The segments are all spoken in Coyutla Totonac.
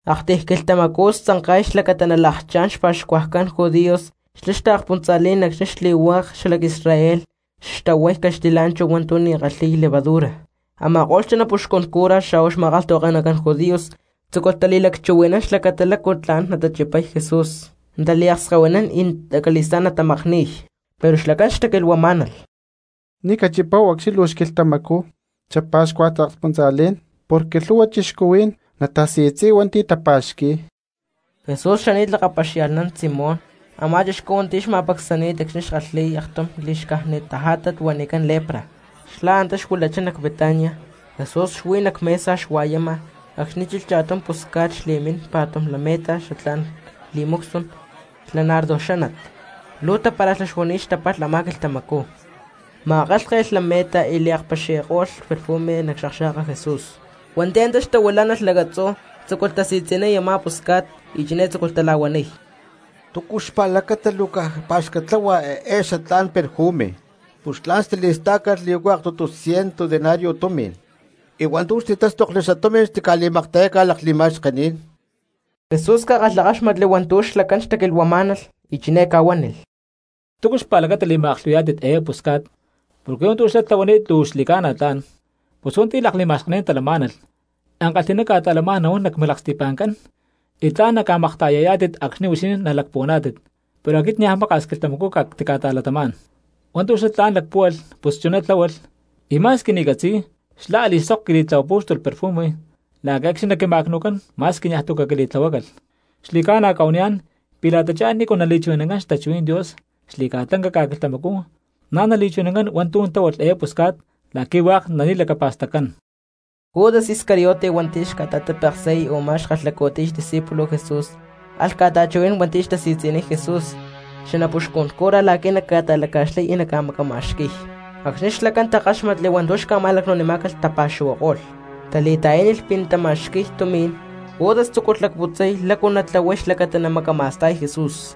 Aktiy quilhtamacú xtzanka̠y xlacata nalakchá̠n xpa̠xcuajcán judíos xla taakspuntza̠lí̠n acxni̠ xli̠hua̠k cristianos xalac Israel xtahuay caxtilá̠nchahu hua̠ntu̠ ni̠tu̠ kalhi̠y levadura. Ama̠ko̠lh xanapuxcun cura xa̠hua xma̠kalhtahuake̠nacán judíos tzúculh tali̠lacchuhui̠nán xlacata lácu tla̠n natachipay Jesús, nataliakskahuinín y acali̠stá̠n natamakni̠y. Pero xlacán xtaquilhuamá̠nalh: —Ni̠ cachipáhu acxni̠ luu xquilhtamacú xapa̠xcuaj taakspuntza̠lí̠n porque lhu̠hua cristianos natasi̠tzi̠y hua̠nti̠ tapa̠xqui̠y. Jesús xani̠t lakapaxia̠lhnán Simón a̠má chixcú hua̠nti̠ xma̠pacsani̠t acxni̠ xkalhi̠y aktum li̠xcájnit tajátat huanicán lepra, xlá antá xuilachá nac Betania. Jesús xuí nac mesa xua̠yama acxni̠ chilh cha̠tum pusca̠t xli̠mín pa̠tum lameta xatlá̠n perfume xla nardo xánat luu tapara̠xlá xuani̠t xtapalh a̠má quilhtamacú. Ma̠kálhke̠lh lameta y liakpaxi̠ko̠lh perfume nac xakxa̠ka Jesús. Hua̠nti̠ antá xtahuilá̠nalh lacatzú tzúculh tasi̠tzi̠niy a̠má pusca̠t y chiné tzúculh tala̠huaniy: —¿Túcu xpa̠lacata luu caj pá̠xcat tláhualh eé xatlá̠n perfume? Pus tla̠n xtili̠stá̠calh li̠huacay aktutu ciento denario tumi̠n, y hua̠ntu̠ xtitástokli xatumi̠n xtica̠li̠makta̠yácalh lakli̠ma̠xkení̠n. Jesús ca̠kalhakáxmatli hua̠ntu̠ xlacán xtaquilhuamá̠nalh y chiné ca̠huánilh: —¿Túcu xpa̠lacata li̠ma̠aklhu̠hui̠yá̠tit eé pusca̠t? Porque hua̠ntu̠ xlá tlahuani̠t luu xli̠ca̠na tla̠n. Pus hua̠nti̠ lakli̠ma̠xkení̠n talamá̠nalh cristianos ankalhi̠ná ca̠ta̠lamá̠n nahuán nac milaksti̠pa̠ncán, y tla̠n naca̠makta̠yayá̠tit acxni̠ huixinín nalacpuhuaná̠tit, pero aquit niaj maka̠s quilhtamacú cactica̠ta̠latamá̠n. Hua̠ntu̠ xlá tla̠n lacpúhualh pus chuná tláhualh, y ma̠squi ni̠ catzi̠y xlá a̠li̠sok quili̠tlahuapú̠xtulh perfumes la̠qui̠ acxni̠ naquima̠cnu̠cán ma̠squi niaj tu̠ caquili̠tlahuácalh. Xli̠ca̠na cca̠huaniyá̠n pi̠ la̠ta chá nícu nali̠chuhui̠nancán xtachuhuí̠n Dios xli̠ca̠lanca ca̠quilhtamacú na̠ nali̠chuhui̠nancán hua̠ntu̠ tláhualh eé pusca̠t la̠qui̠ hua̠k nali̠lacapa̠staccán. Judas Iscariote hua̠nti̠ xta̠tapeksi̠y a̠má xkalhacu̠tiy xdiscípulos Jesús alh ca̠ta̠chuhui̠nán hua̠nti̠ xtasi̠tzi̠niy Jesús xanapuxcun cura la̠qui̠ naca̠ta̠laca̠xlay y naca̠macama̠xqui̠y. Acxni̠ xlacán takáxmatli hua̠ntu̠ xca̠ma̠lacnu̠nimá̠calh xlacán tapa̠xuhuako̠lh, tali̠ta̠yánilh pi̠ natama̠xqui̠y tumi̠n; Judas tzúculh lacputzay lácu natlahuay xlacata namacama̠sta̠y Jesús.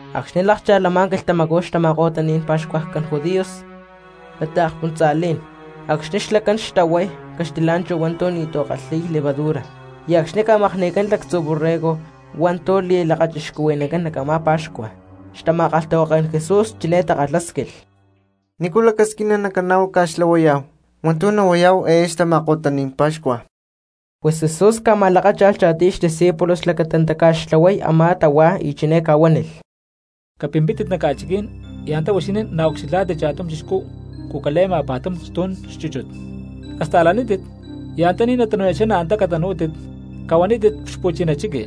Acxni̠ lákcha̠lh a̠má quilhtamacú xtama̠ko̠taní̠n xpa̠xcuajcán judíos xla taakspuntza̠lí̠n acxni̠ xlacán tahuay caxtilá̠nchahu hua̠ntu̠ ni̠tu̠ kalhí̠y levadura y acxni̠ ca̠makni̠cán xalactzu borrego hua̠ntu̠ li̠lakachixcuhui̠nancán nac a̠má pa̠xcua, xtama̠kalhtahuaké̠n Jesús chiné takalhásquilh: —¿Nícu lacasquina nacaná̠hu ca̠xtlahuayá̠hu hua̠ntu̠ nahuayá̠hu eé xtama̠ko̠taní̠n pa̠xcua? Pus Jesús ca̠ma̠lakácha̠lh cha̠tiy xdiscípulos xlacata nataca̠xtlahuay a̠má tahuá, y chiné ca̠huánilh: —Capimpítit nac ca̠chiquí̠n y antá huixinín naucxilhá̠tit cha̠tum chixcú cucale̠ma pa̠tum stu̠n chúchut. Casta̠lanítit y antaní natanu̠ya̠chá na̠ antá catanú̠tit, cahuanítit xpu̠china chiqui: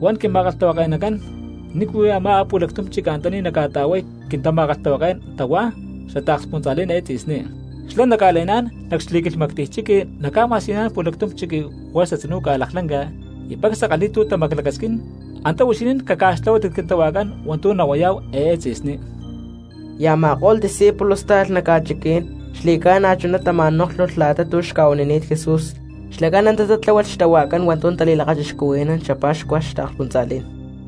“Huan quima̠kalhtahuake̠nacán: ¿Nícu huí amá pu̠lactum chiqui antaní nacca̠ta̠huay quintama̠kalhtahuaké̠n tahuá xla taakspuntza̠lí̠n eé tzi̠sní?” Xlá naca̠le̠ná̠n, nac xli̠quilhmactiy chiqui naca̠ma̠siyuniyá̠n pu̠lactum chiqui juerza tzinú ca̠laklanca y pacsa kalhi̠y tu̠ tamaclacasquín, antá huixinín caca̠xtlahuátit quintahuajcán hua̠ntu̠ nahuayá̠hu eé tzi̠sní. Y a̠ma̠ko̠lh discípulos táalh nac ca̠chiquí̠n, xli̠ca̠na chuná tama̠nóklhulh la̠ta tu̠ xca̠huanini̠t Jesús, xlacán antá taca̠xtláhualh tahuá hua̠ntu̠ natali̠lakachixcuhui̠nán xapa̠xcua taakspuntza̠lí̠n.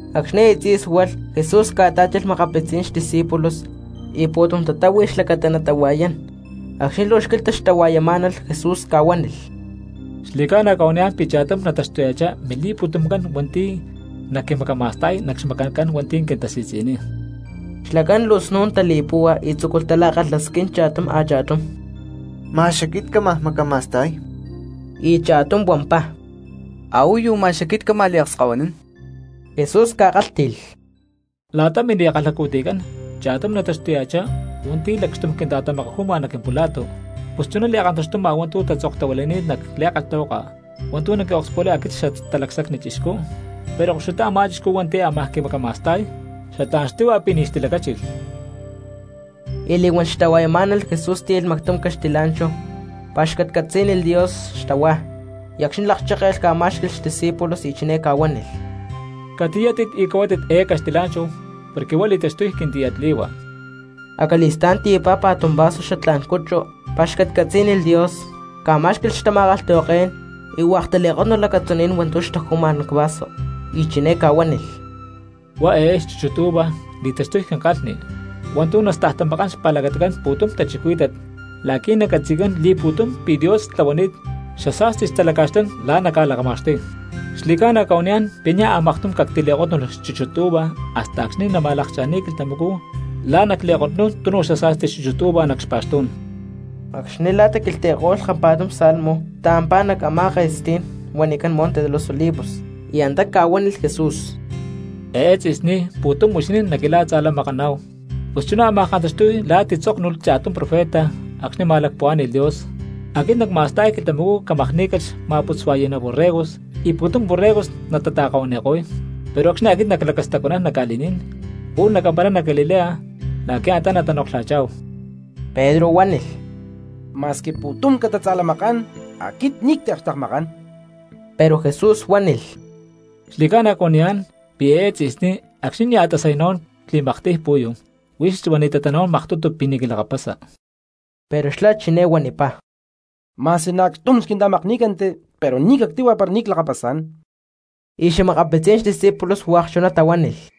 Acxni̠ aya tzí̠sualh, Jesús ca̠tá̠chilh xa̠makapitzí̠n xdiscípulos y pu̠tum tatáhui xlacata natahua̠yán. Acxni̠ luu xquilhta xtahua̠yamá̠nalh Jesús ca̠huánilh: —Xli̠ca̠na cca̠huaniyá̠n pi̠ chá̠tum nataxtuya̠chá mili̠pu̠tumcán hua̠nti̠ naquimacama̠sta̠y nac xmacancán hua̠nti̠ quintasi̠tzi̠niy. Xlacán luu snu̠n tali̠púhua y tzúculh tala̠kalhasquín cha̠tum a̠cha̠tum: —¿Ma̠x aquit cámaj macama̠sta̠y? Y cha̠tum huampá: —¿Ahuayu ma̠x aquit cámaj liakskahuinín? Jesús ca̠kálhti̠lh: —La̠ta mili̠kalhacu̠tiycán cha̠tum nataxtuya̠chá hua̠nti̠ lakxtum quinta̠tamakaju̠ma nac quimpula̠tucán. Pus chuná li̠kantaxtuma hua̠ntu̠ tatzoktahuilani̠t nac li̠kalhtahuaka hua̠ntu̠ naquiakspulay aquit Xatalacsacni Chixcú; pero koxutá a̠má chixcú hua̠nti̠ ámaj quimacama̠sta̠y. ¡Xatlá̠n xtíhua pi̠ ni̠ xtilacáchilh! Y li̠huán xtahua̠yamá̠nalh Jesús tíyalh mactum caxtilá̠nchahu, pa̠xcatcatzí̠nilh Dios xtahuá, y acxni̠ lakchékelh ca̠má̠xqui̠lh xdiscípulos y chiné ca̠huánilh: —Catiyátit y cahuátit eé caxtilá̠nchahu porque huá li̠taxtuy quintiyatli̠hua. Acali̠stá̠n tiyapá pa̠tum vaso xchúchut uva, pa̠xcatcatzí̠nilh Dios, ca̠má̠xqui̠lh xtama̠kalhtahuaké̠n; y hua̠k tali̠kótnulh acatzuní̠n hua̠ntu̠ xtaju̠ma cvaso. Y chiné ca̠huánilh: —Huá eé xchúchut uva li̠taxtuy quinkalhni hua̠ntu̠ nastajtamakán xpa̠lacatacán pu̠tum cristianos la̠qui̠ nacatzi̠cán li̠pu̠tum pi̠ Dios tlahuani̠t xasa̠sti xtalaca̠xlán la̠ naca̠lakma̠xtuy. Xli̠ca̠na cca̠huaniyá̠n pi̠ niaj maktum cactili̠kótnulh xchúchut uva hasta acxni̠ nama̠lakcha̠níy quilhtamacú la̠ nacli̠kotnún tunu xasa̠sti xchúchut uva nac xpa̠xtú̠n. Acxni̠ la̠ taquilhtli̠ko̠lh kampa̠tum salmo taampá nac amá ke̠stí̠n huanicán Monte de los Olivos. Y antá ca̠huánilh Jesús: —Eé tzi̠sní pu̠tum huixinín naquila̠tza̠lamakaná̠hu. Pus chuná ámaj kantaxtuy la̠ titzóknulh cha̠tum profeta acxni̠ ma̠lacpuhuá̠ni̠lh Dios: “Aquit nacma̠sta̠y quilhtamacú camakní̠calh xma̠putzua̠yi̠ná borregos y pu̠tum borregos natata̠kahuani̠ko̠y.” Pero acxni̠ aquit naclacastacuanán nac ca̠li̠ní̠n pu̠lh nacamparay nac Galilea la̠qui̠ antá natanoklha̠chá̠hu. Pedro huánilh: —Ma̠squi pu̠tum catatza̠lamakán, aquit ni̠ cactiakxtekmakán. Pero Jesús huánilh: —Xli̠ca̠na cuaniyá̠n pi̠ eé tzi̠sní acxni̠ nia̠ tasay nahuán xli̠maktiy pu̠yu, huix huani̠tatá nahuán maktutu pi̠ ni̠ quilakapasa. Pero xlá chiné huanipá: —Ma̠squi na̠ acxtum xquinta̠makní̠canti, pero ni̠ cactíhua pi̠ ni̠ clakapasá̠n. Y xa̠makapitzí̠n discípulos hua̠k chuná tahuánilh.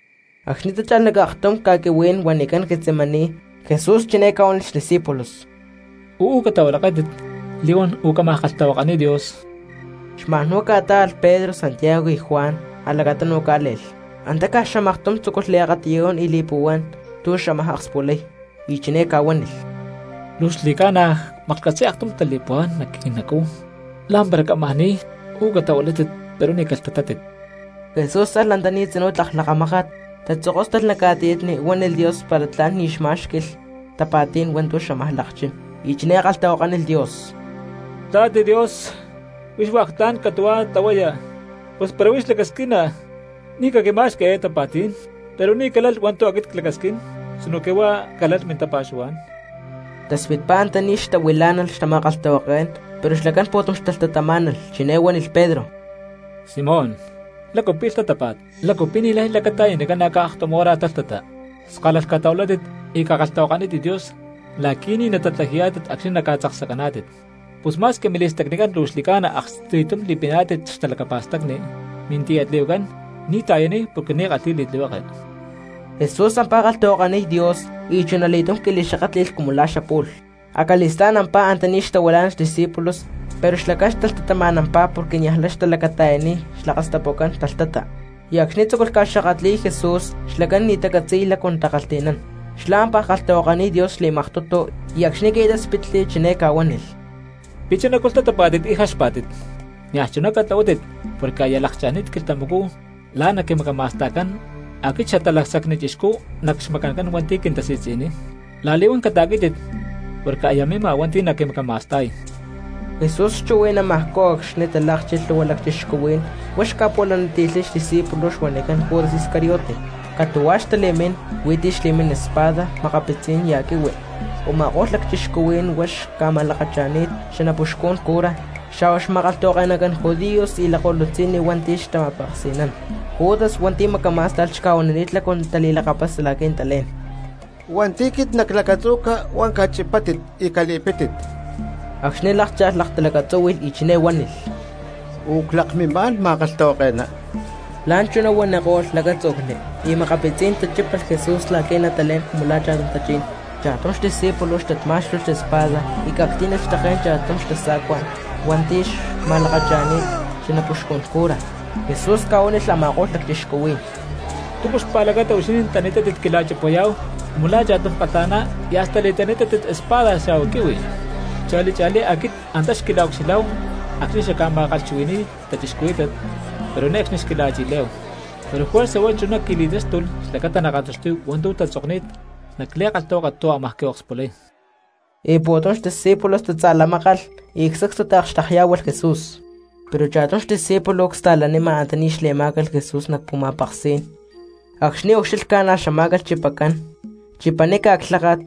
Acxni̠ tácha̠lh nac aktum ca̠quihuí̠n huanicán Getsemaní, Jesús chiné ca̠huánilh xdiscípulos: —Uú catahuilaké̠tit li̠huán u̠cámaj kalhtahuakaniy Dios. Xma̠n huá ca̠tá̠alh Pedro, Santiago y Juan a̠lacatunu cá̠le̠lh. Antá caj xamaktum tzúculh liakatiyún y li̠li̠puhuán tu̠ xámaj akspulay. Y chiné ca̠huánilh: —Luu xli̠ca̠na cmaklhcatzi̠y aktum tali̠puhuá̠n nac quinacú, la̠mpara cámaj ni̠y. Uú catahuilátit pero ni̠ calhtatátit. Jesús alh tzinú antaní tlak lakamákat, tatzokóstalh nac ca̠tiyatni, huánilh Dios para tla̠n ni̠ xmá̠xqui̠lh tapa̠tí̠n hua̠ntu̠ xámaj lakchá̠n. Y chiné kalhtahuakánilh Dios: —Quintla̠t Dios, huix hua̠k tla̠n catu̠huá tlahuaya, pus para huix lacasquina ni̠ caquima̠xqui eé tapa̠tí̠n, pero ni̠ calalh hua̠ntu̠ aquit clacasquín sinoque huá calalh mintapa̠xuhuá̠n. Taspitpá antaní xtahuilá̠nalh xtama̠kalhtahuaké̠n pero xlacán pu̠tum xtalhtatamá̠nalh. Chiné huánilh Pedro: —Simón, ¿lácu pi̠ lhtatápa̠t? ¿Lácu pi̠ ni̠lay lacata̠yani ca̠na̠caj aktum hora talhtata? Skálalh catahuilátit y cakalhtahuakanítit Dios la̠qui̠ ni̠ natatlaji̠yá̠tit acxni̠ naca̠tzaksacaná̠tit. Pus ma̠squi mili̠stacnicán luu xli̠ca̠na aksti̠tum li̠piná̠tit xtalacapa̠stacni, mintiyatli̠huacán ni̠ ta̠yaniy porque ni̠ kalhi̠y li̠tlihueke. Jesús ampá kalhtahuakaniy Dios y chunali̠túm qui̠li̠xakátli̠lh cumu la̠ xapu̠lh. Acali̠stá̠n ampá antaní xtahuilá̠nalh xdiscípulos pero xlacán xtalhtatama̠nampá porque niajlay xtalacata̠yaniy xlakastapucán talhtata. Y acxni̠ tzúculh ca̠xakatli̠y Jesús, xlacán ni̠ xtacatzi̠y lácu natakalhti̠nán. Xlá ampaj kalhtahuakaniy Dios xli̠maktutu, y acxni̠ qui̠táspitli chiné ca̠huánilh: —¿Pi̠ chunacú lhtatapá̠tit y jaxpá̠tit? Niaj chuná catlahuátit porque aya lakcha̠ni̠t quilhtamacú la̠ naquimacama̠sta̠cán aquit Xatalacsacni Chixcú nac xmacancán hua̠nti̠ quintasi̠tzi̠niy. La̠li̠huán cata̠quí̠tit porque aya mima hua̠nti̠ naquimacama̠sta̠y. Jesús xchuhui̠namajcú acxni̠ talákchilh lhu̠hua cristianos huá xca̠pu̠laniti̠lhay xdiscípulo huanicán Judas Iscariote. Catu̠huá xtali̠mín, hui̠ntí xli̠mín espada, makapitzí̠n ya̠ quihui. Uma̠kó̠lh lacchixcuhuí̠n huá xtama̠lakacha̠ni̠t xanapuxcún cura, xa̠hua xma̠kalhtahuake̠nacán judíos y lakko̠lutzi̠nni hua̠nti̠ xtama̠peksi̠nán. Judas hua̠nti̠ macamá̠sta̠lh xca̠huanini̠t lácu natali̠lakapasa la̠qui̠ natalé̠n: —Hua̠nti̠ quit naclacatzu̠ca huá cachipátit y cali̠pítit. Acxni̠ lákcha̠lh, laktalacatzúhui̠lh y chiné huánilh: —Uú clakmimá̠n, ma̠kalhtahuake̠ná. La̠nchuná huaniko̠lh lacátzu̠cli. Y makapitzí̠n tachípalh Jesús la̠qui̠ natalé̠n cumu la̠ cha̠tum tachí̠n. Cha̠tum xdiscípulo xtat má̠xtulh xespada y ca̠ctí̠nilh xtaké̠n cha̠tum xtasa̠cuacán hua̠nti̠ xtama̠lakacha̠ni̠t xanapuxcun cura. Jesús ca̠huánilh a̠ma̠ko̠lh lacchixcuhuí̠n: —¿Túcu xpa̠lacata huixinín tani̠tátit quila̠chipayá̠hu cumu la̠ cha̠tum kalha̠ná y hasta li̠tani̠tátit espada xa̠hua quihui? Cha̠li cha̠lí aquit antá xquila̠ucxilhá̠hu acxni̠ xacca̠ma̠kalhchuhui̠ni̠y cristianos, pero ne̠cxni xquila̠chi̠lé̠hu; pero juerza huá chuná qui̠li̠táxtulh xlacata nakantaxtuy hua̠ntu̠ tatzokni̠t nac li̠kalhtahuaka tu̠ ámaj quiakspulay. Y pu̠tum xdiscípulos tatza̠lamákalh, sacstu taakxtekyá̠hualh Jesús. Pero cha̠tum xdiscípulo csta̠lanima antaní xlacle̠ma̠ca Jesús nac pu̠ma̠peksí̠n; acxni̠ ucxílhca na̠ xamá̠calh chipacán. Chipaníca clháka̠t,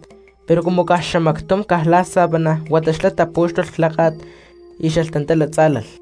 pero cumu caj xamactum caj la̠ sábana, huata xlá tapú̠xtulh clháka̠t y xalhtantala tzá̠lalh.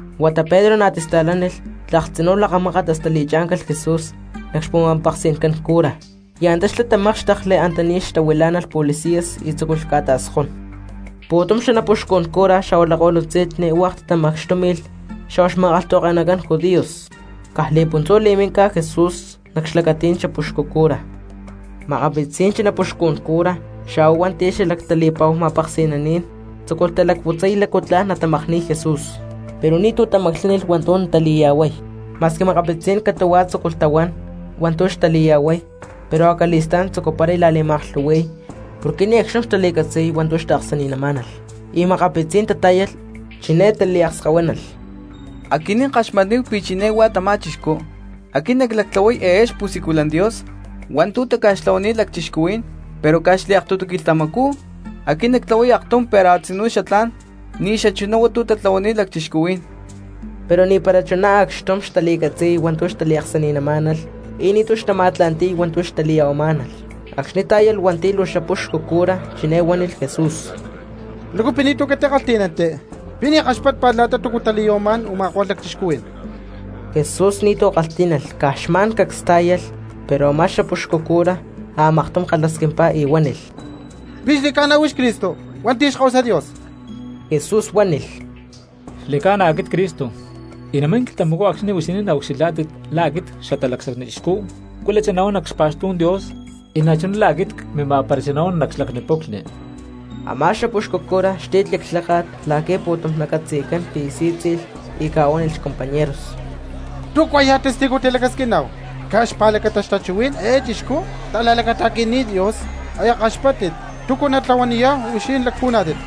Huata Pedro na̠ tista̠lánilh tlak tzinú lakamákat hasta li̠chá̠ncalh Jesús nac xpu̠ma̠peksi̠ncán cura y antá xlá tamákxtekli antaní xtahuilá̠nalh policías y tzúculh ca̠ta̠skón. Pu̠tum xanapuxcun cura xa̠hua lakko̠lutzi̠nni hua̠k tatamacxtúmi̠lh xa̠hua xma̠kalhtahuake̠nacán judíos. Caj li̠puntzú li̠mínca Jesús nac xlacatí̠n xapuxcu cura. Makapitzí̠n xanapuxcun cura xa̠hua hua̠nti̠ xalactali̠pa̠hu ma̠peksi̠naní̠n tzúculh talacputzay lácu tla̠n natamakni̠y Jesús, pero ni̠tu̠ tamaclánilh hua̠ntu̠ natali̠ya̠huay. Ma̠squi makapitzí̠n cristianos catu̠huá tzúculh tahuán hua̠ntu̠ xtali̠ya̠huay pero acali̠stá̠n xtzucuparay tala̠li̠ma̠aklhu̠hui̠y porque ni̠ acxtum xtali̠catzi̠y hua̠ntu̠ xtaaksani̠namá̠nalh. Y makapitzí̠n tatá̠yalh, chiné taliakskahuínalh: —Aquinín ckaxmatni̠táhu pi̠ chiné huá tamá chixcú: “Aquit naclactlahuay eé xpu̠siculan Dios hua̠ntu̠ taca̠xtlahuani̠t lacchixcuhuí̠n pero caj xliaktutu quilhtamacú aquit nactlahuay aktum pero a̠tzinú xatlá̠n ni̠xachuná hua̠ntu̠ tlahuani̠t lacchixcuhuí̠n.” Pero ni̠para chuná acxtum xtali̠catzi̠y hua̠ntu̠ xtaliaksani̠namá̠nalh y ni̠tu̠ xtama̠tla̠nti̠y hua̠ntu̠ xtali̠ya̠huamá̠nalh. Acxni̠ tá̠yalh hua̠nti̠ luu xapuxcu cura, chiné huánilh Jesús: —¿Lácu pi̠ ni̠tu̠ catikalhtí̠nanti? ¿Pi̠ ni̠ kaxpátpa̠t la̠ta túcu tali̠ya̠huamá̠n u̠ma̠ko̠lh lacchixcuhuí̠n? Jesús ni̠tu̠ kalhtí̠nalh, caj xma̠n cacs tá̠yalh. Pero a̠má xapuxcu cura a̠maktum kalhasquimpá y huánilh: —¿Pi̠ xli̠ca̠na huix Cristo hua̠nti̠ Xkahuasa Dios? Jesús huánilh: —Xli̠ca̠na aquit Cristo. Y namín quilhtamacú acxni̠ huixinín naucxilhá̠tit la̠ aquit Xatalacsacni Chixcú cuilachá nahuán nac xpa̠xtú̠n Dios, y na̠chuná la̠ aquit cmima̠parachá nahuán nac xlacni puclhni. Amá xapuxcu cura xti̠tli clháka̠t la̠qui̠ pu̠tum nacatzi̠cán pi̠ sí̠tzi̠lh, y ca̠huánilh xcompañeros: —¿Túcuajya̠ testigos tilacasquiná̠hu? Caj xpa̠lacata xtachuhuí̠n eé chixcú ta̠la̠lacata̠qui̠ni̠t Dios, aya kaxpáttit. ¿Túcu natlahuaniyá̠hu, huixinín lacpuhuaná̠tit?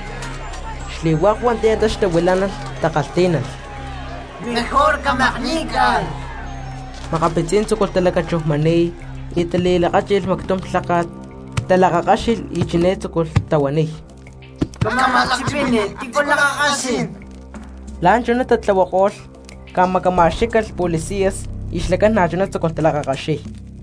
Xli̠hua̠k hua̠nti̠ antá xtahuilá̠nalh takalhtí̠nalh: —¡Mejor camakní̠calh! Makapitzí̠n tzúculh talacachujmani̠y, tali̠lakáchi̠lh mactum lháka̠t, talakakáxilh y chiné tzúculh tahuaniy: —Cama̠lakchipini, ¿tícu lakakaxín? La̠nchuná tatlahuako̠lh ca̠macama̠xquí̠calh policías y xlacán na̠chuná tzúculh talakakaxiy.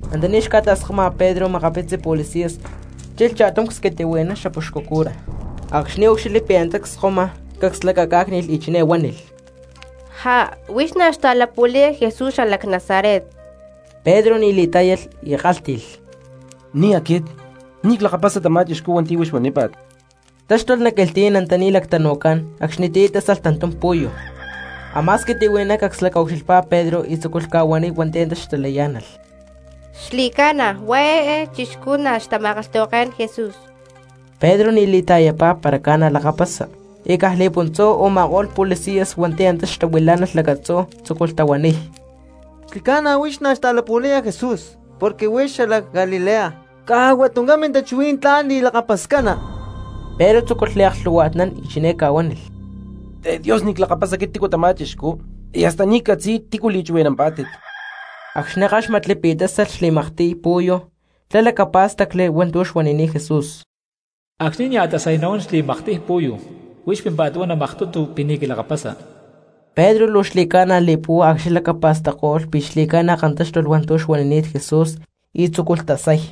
Antaní xca̠ta̠skoma Pedro makapitzi policías chilh cha̠tum csquitihui̠ná xapuxcu cura. Acxni̠ úcxilhli pi̠ antá cskoma, cacs lacacá̠cni̠lh y chiné huánilh: —Huix na̠ xta̠lapu̠laya Jesús xalac Nazaret. Pedro ni̠ li̠tá̠yalh y kálhti̠lh: —Ni̠ aquit, ni̠ clakapasa tamá chixcú hua̠nti̠ huix huanípa̠t. Táxtulh nac quilhtí̠n antaní lactanu̠cán acxnitiyá tásalh tantum pu̠yu. Amá squitihui̠ná cacs lacaucxilhpá Pedro y tzúculh ca̠huaniy hua̠nti̠ antá xtalayá̠nalh: —Xli̠ca̠na huá eé chixcú na̠ xtama̠kalhtahuaké̠n Jesús. Pedro ni̠ li̠ta̠yapá para ca̠na lakapasa, y caj li̠puntzú a̠ma̠ko̠lh policías hua̠nti̠ antá xtahuilá̠nalh lacatzú tzúculh tahuaniy: —Xli̠ca̠na huix na̠ xta̠lapu̠laya Jesús porque huix xalac Galilea, caj huá tuncán mintachuhuí̠n tlán li̠lakapascana. Pedro tzúculh liaklhu̠hua̠tnán y chiné ca̠huánilh: —Te Dios ni̠ clakapasa aquit tamá chixcú, y hasta ni̠ ccatzi̠y tícu li̠chuhui̠nampá̠tit. Acxni̠ káxmatli pi̠ tásalh xli̠maktiy pu̠yu xlá lacapá̠stacli hua̠ntu̠ xuanini̠t Jesús: “Acxni̠ nia̠ tasay nahuán xli̠maktiy pu̠yu huix pímpa̠t huana maktutu pi̠ ni̠ quilakapasa.” Pedro luu xli̠ca̠na li̠púhua acxni̠ lacapa̠stacko̠lh pi̠ xli̠ca̠na kantáxtulh hua̠ntu̠ xuanini̠t Jesús y tzúculh tasay.